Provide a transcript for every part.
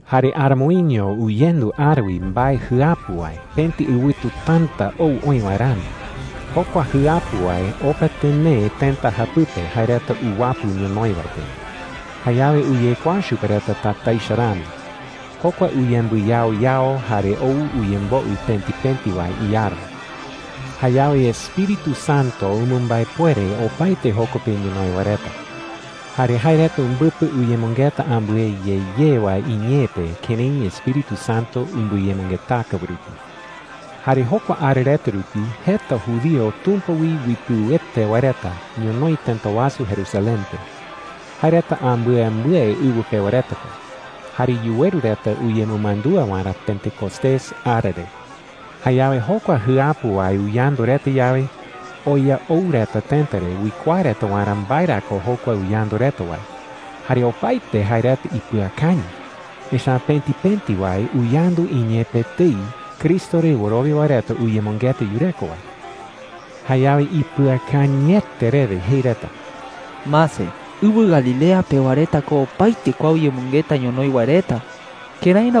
Jare aramoiño uyendu ara wi mbae jɨapu wae pëti ɨwɨtu täta ou oï wae rami. Jokua jɨapu wae opa tɨnee tëta japɨpe jae reta uwapɨ ñonoï wae pe. Jayawe uyekuaa chupe reta tata echa rami. Jokua uyembɨyaoyao jare ou uyemboɨ pëti pëti wae iáramo. Jayawe Espíritu Santo umɨmbaepuere opaete joko pe ñonoï wae reta. Jare jae reta umbɨpɨ uyemɨngeta ambɨe ye ye wae iñee pe kërái Espíritu Santo umbɨyemɨngetaka wae rupi. Jare jokua ara reta rupi jeta judío Judío ko jae kía Israel iñemoñaa pewa. Tumpa wi uipɨuete wae reta ñonoï tëta wasu Jerusalén pe. Jae reta ambɨembɨe ɨwɨ pewa reta ko. Jare yuweru reta uyemɨmandúa waerä Pentecostés ara re. Jayawe jokua jɨapu wae uyandu reta yawe, oya ou reta tëta re uikuaa reta waerä mbae ra ko jokua uyandu reta wae. Jare opaete jae reta ipɨakañɨ. Echa’ä pëti pëti wae uyandu iñee pe etei Cristo re wɨrowia wae reta uyemɨngeta yureko wae. Jayawe ipɨakañɨete rewe jei reta: “¡Mase, ɨwɨ Galilea pewa reta ko opaete kua uyemɨngeta ñonoï wae reta!” jei reta.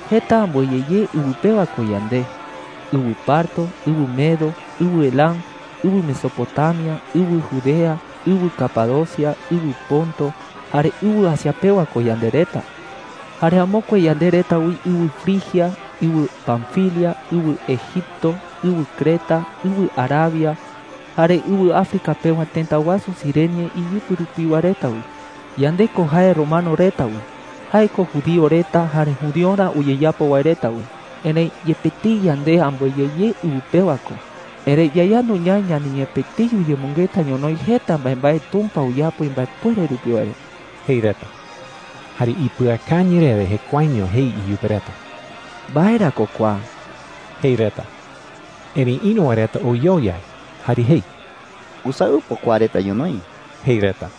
“Jeta ambɨe ye ye ɨwɨ pewa ko yande: ɨwɨ Parto, ɨwɨ Medo, ɨwɨ Elam, ɨwɨ Mesopotamia, ɨwɨ Judea, ɨwɨ Capadocia, ɨwɨ Ponto, jare ɨwɨ Asia pewa ko yande reta,” jei reta. “Jare amokue yande reta wi ɨwɨ Frigia, ɨwɨ Panfilia, ɨwɨ Egipto, ɨwɨ Creta, ɨwɨ Arabia, jare ɨwɨ África pewa tëta wasu Cirene iyɨpɨ rupiwa reta wi. Yande ko jae romano reta wi – jae ko judío reta jare judiorä uyeyapo wae reta wi. Erëi yepe tëi yande ambɨe ye ye ɨwɨ pewa ko, erëi yayandu ñaï ñaniñee pe etei uyemɨngeta ñonoï jeta mbaembae Tumpa uyapo imbaepuere rupi wae re,” jei reta. Jare ipɨakañɨ rewe jekuaeño jei iyupe reta: “¿Mbae ra ko kua?” jei reta. Erëi ïru wae reta oyoyai jare jei: “Usawɨpo kua reta ñonoï,” jei reta.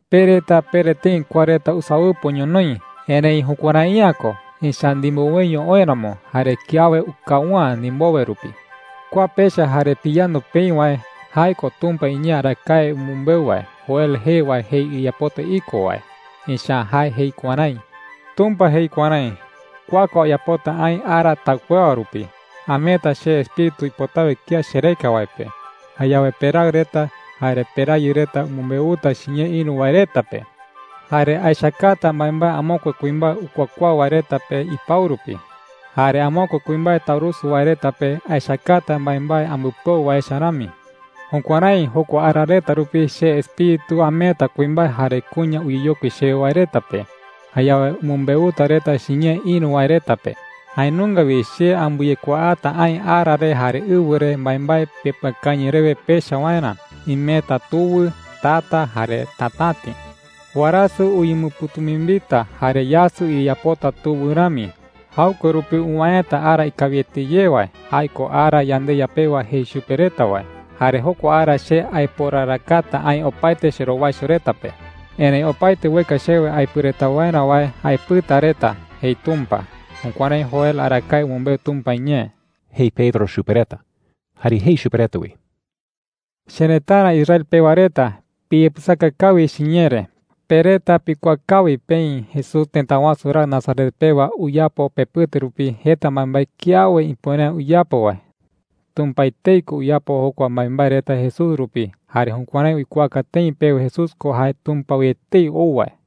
“Pe reta pere tëi kua reta usawɨpo ñonoï. Erëi jukuärai’ä ko. Echa’ä ndimboweño oï ramo, jare kiawe ukau’ä ndimbowe rupi,” jei chupe reta. “Kua pecha jare piyandu peï wae, jae ko Tumpa iñee arakae umɨmbeu wae Joel jee wae jei uyeyapota iko wae. Echa’ä jae jei kuärái: ‘Tumpa jei kuärái: ‘Kua ko ayapota aï ara taɨkuewa rupi: Ameeta cheEspíritu ipotawe kía chereka wae pe. Jayawe peraɨ reta jare perayɨ reta umɨmbeuta chiñee ïru wae reta pe. Jare aechakata mbaembae amokue kuimbae ukuakuaa wae reta pe ipau rupi. Jare amokue kuimbae taurusu wae reta pe aechakata mbaembae ambɨpau wae echa rami. Jukuärái jokua ara reta rupi cheEspíritu ameeta kuimbae jare kuña uyeyokui chewe wae reta pe. Jayawe umɨmbeuta reta chiñee ïru wae reta pe. Jae nunga wi che ambɨyekuaata aï ara re jare ɨwɨ re mbaembae pepɨakañɨ rewe pecha waerä. Imeta tuwɨ, tata, jare tatäti. Warasɨ uñemɨpɨ̈tumimbita, jare yasɨ uyeyapota tuwɨ rami. Jaɨkue rupi uwäeta ara ikawiete ye wae – jae ko ara yandeYa pewa jei chupe reta wae. Jare jokua ara che aiporarakata aï opaete cherowaicho reta pe. Erëi opaete ueka chewe aepɨ reta waerä wae aepɨta reta,’ jei Tumpa.’ Jukuärái Joel arakae umɨmbeu Tumpa iñee,” jei Pedro chupe reta. Jare jei chupe reta wi: “Cherëtara Israel pewa reta, piyapɨsaka kawi chiñee re: Pe reta pikuaa kawi peï Jesús tëta wasu raɨ Nazaret pewa uyapo pepɨte rupi jeta mbaembae kiawe ipuere’ä uyapo wae. Tumpa etei ko uyapo jokua mbaembae reta Jesús rupi jare jukuärái uikuaaka tëi pewe Jesús ko jae Tumpa wi etei ou wae,” jei.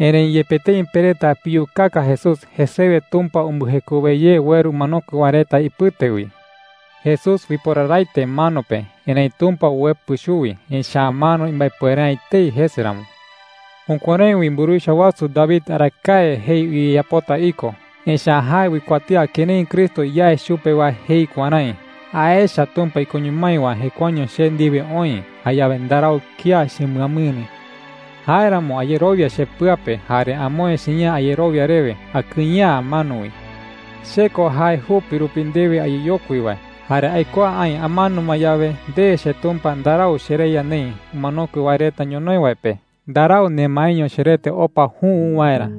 “Erëi yepe tëi pe reta piyukaka Jesús, jesewe Tumpa umbɨjekowe ye ueru umanokue wae reta ipɨte wi,” jei. “Jesús uiporaraete mano pe. Erëi Tumpa uepɨ chuwi, echa’ä mano imbaepuere’ä etei jese ramo. Jukuärái wi mburuwicha wasu David arakae jei uyeyapota iko. Echa’ä jae uikuatía kërái Cristo yae chupe wae jei kuärái: ‘Aecha Tumpa ikoño mái wae jekuaeño che ndiwe oï. Jayawe ndarau kía chemɨamɨri. Jáeramo ayerowia chepɨa pe, jare amoë chiñee ayerowia rewe. Akɨye’ä mano wi. Che ko jae jupi rupi ndewe ayeyokui wae. Jare aikuaa aï amano ma yawe, nde, cheTumpa, ndarau chereya neï umanokue wae reta ñonoï wae pe. Ndarau nemaeño cherete opa jüu waerä.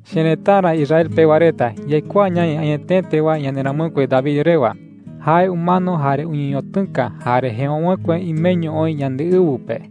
“Cherëtara Israel pewa reta, yaikuaa ñaï añetete wae yanderamɨkue David rewa. Jae umano jare uñeñotɨka, jare jeöwekue imeño oï yandeɨwɨ pe.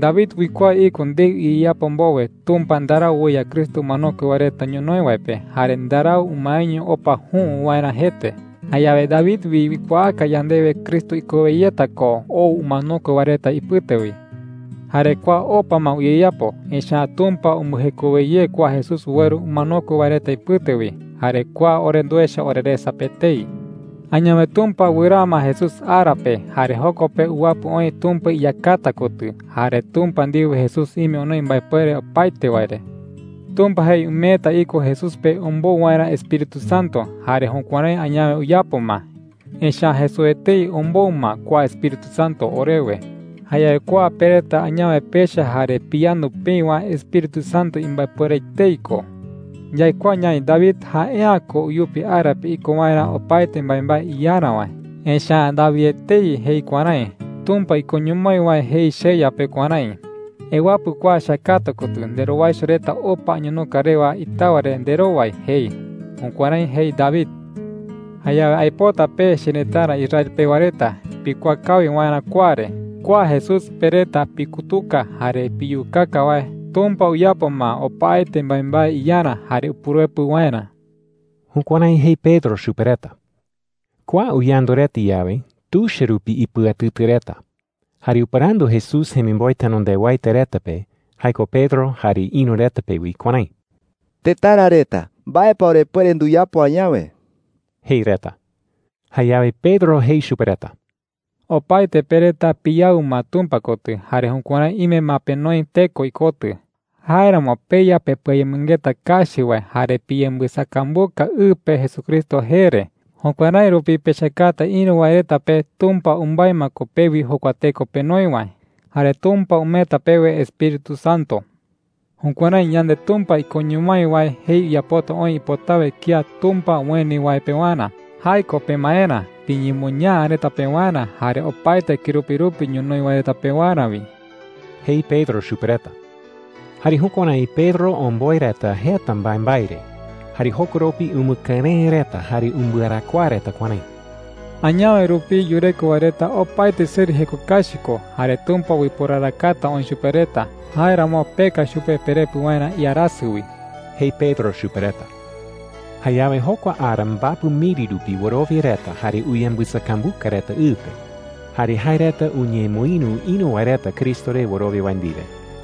“David uikuaa iko ndei uyeyapo mbowe Tumpa ndarau ueya Cristo umanokue wae reta ñonoï wae pe jare ndarau umaeño opa jüu waerä jete. Jayawe David wi uikuaaka yandewe Cristo ikowe yeta ko ou umanokue wae reta ipɨte wi,” jei chupe reta. “Jare kua opa ma uyeyapo, echa’ä Tumpa umbɨjekowe ye kua Jesús ueru umanokue wae reta ipɨte wi. Jare kua ore nduecha oreresa pe etei,” jei. “Añawe Tumpa wɨraa ma Jesús ara pe. Jare joko pe uwapɨ oï Tumpa iyakata kotɨ, jare Tumpa ndiwe Jesús ime onoi mbaepuere opaete wae re,” jei. “Tumpa jei umeeta iko Jesús pe ombou waerä Espíritu Santo, jare jukuärái añawe uyapo ma. Echa’ä Jesús etei ombou ma kua Espíritu Santo orewe. Jayawe kua pe reta añawe pecha jare piyandu peï wae Espíritu Santo imbaepuere etei ko,” jei chupe reta. “Yaikuaa ñaï David jae’ä ko uyupi ara pe iko waerä opaete mbaembae iYarä wae. Echa’ä David etei jei kuärái: ‘Tumpa ikoño mái wae jei cheYa pe kuärái: ‘Ewapɨ kua cheakata kotɨ, nderowaicho reta opa añonoka rewa itawa re nderowai,’ jei.’ Jukuärái jei David,” jei chupe reta. “Jayawe aipota pe cherëtara Israel pewa reta pikuaa kawi waerä kua re: kua Jesús pe reta pikutuka jare piyukaka wae, Tumpa uyapo ma opaete mbaembae iYarä jare Upuruepɨ waerä.” Jukuärái jei Pedro chupe reta. Kua uyandu reta yawe, tuicha rupi ipɨatɨtɨ reta. Jare upɨrandu Jesús jemimboe tenondewaete reta pe – jae ko Pedro jare ïru reta pe wi – kuärái: “Tëtara reta, ¿mbae pa orepuere nduyapo añawe?” jei reta. Jayawe Pedro jei chupe reta: “Opaete pe reta piyawɨ ma Tumpa kotɨ jare jukuärái ime ma penoi teko ikotɨ. Jáeramo peya pepɨayemɨngeta kachi wae jare piyembɨsakambuka ɨ pe Jesucristo jee re. Jukuärái rupi pechakata ïru wae reta pe Tumpa umbái ma ko pewi jokua teko penoi wae. Jare Tumpa umeeta pewe Espíritu Santo,” jei chupe reta. “Jukuärái yandeTumpa ikoño mái wae jei uyapota oï ipotawe kía Tumpa ueni wae pewarä – jae ko pemaerä, piñemoñaa reta pewarä, jare opaete kerupi rupi ñonoï wae reta pewarä wi,” jei Pedro chupe reta. Jare jukuärái Pedro omboe reta jeta mbaembae re, jare jokoropi umɨkɨrëɨ reta jare umbɨarakuaa reta kuärái: “Añawe rupi yureko wae reta, opaete seri jeko kachi ko, jare Tumpa uiporarakata oï chupe reta. Jáeramo peka chupe perepɨ waerä iarasɨ wi,” jei Pedro chupe reta. Jayawe jokua ara mbapɨ miri rupi wɨrowia reta jare uyembɨsakambuka reta ɨ pe. Jare jae reta uñemɨïru ïru wae reta Cristo re wɨrowia wae ndiwe.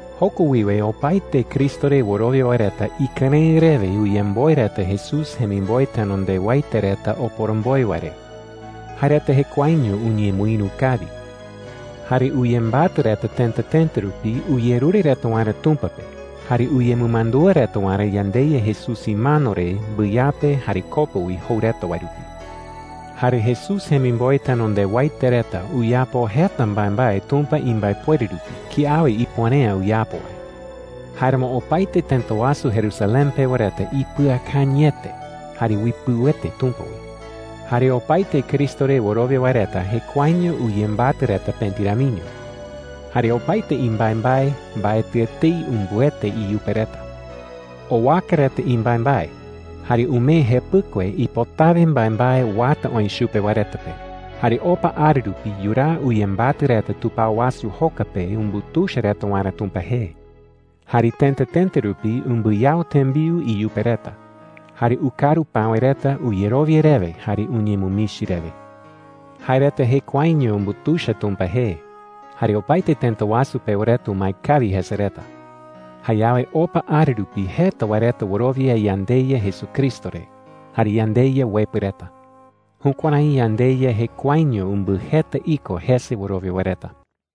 Joko wiwe opaete Cristo re wɨrowia wae reta ikɨrëɨ rewe uyemboe reta Jesús jemimboe tenondewaete reta oporomboe wae re. Jae reta jekuaeño uñemɨïru kawi. Jare uyembatɨ reta tëta tëta rupi uyerure reta waerä Tumpa pe, jare uyemɨmandúa reta waerä yandeYa Jesús imano re mbɨyape jare copa wi jou reta wae rupi. Jare Jesús jemimboe tenondewaete reta uyapo jeta mbaembae Tumpa imbaepuere rupi kiawe ipuere’ä uyapo wae. Jáeramo opaete tëta wasu Jerusalén pewa reta ipɨakañɨete jare uipɨuete Tumpa wi. Jare opaete Cristo re wɨrowia wae reta jekuaeño uyembatɨ reta pëti ramiño. Jare opaete imbaembae mbaetɨ etei umbɨete iyupe reta. Owaka reta imbaembae, jare umee jepɨkue ipotawe mbaembae uata oï chupe wae reta pe. Jare opa ara rupi yuraa uyembatɨ reta tupao wasu joka pe umbutuicha reta waerä Tumpa jee. Jare tëta tëta rupi umbɨyao tembiu iyupe reta, jare ukaru päwe reta uyerowia rewe jare uñemɨmichi rewe. Jae reta jekuaeño umbutuicha Tumpa jee, jare opaete tëta wasu pewa reta umae kawi jese reta. Jayawe opa ara rupi jeta wae reta wɨrowia yandeYa Jesucristo re, jare yandeYa uepɨ reta. Jukuärái yandeYa jekuaeño umbɨjeta iko jese wɨrowia wae reta.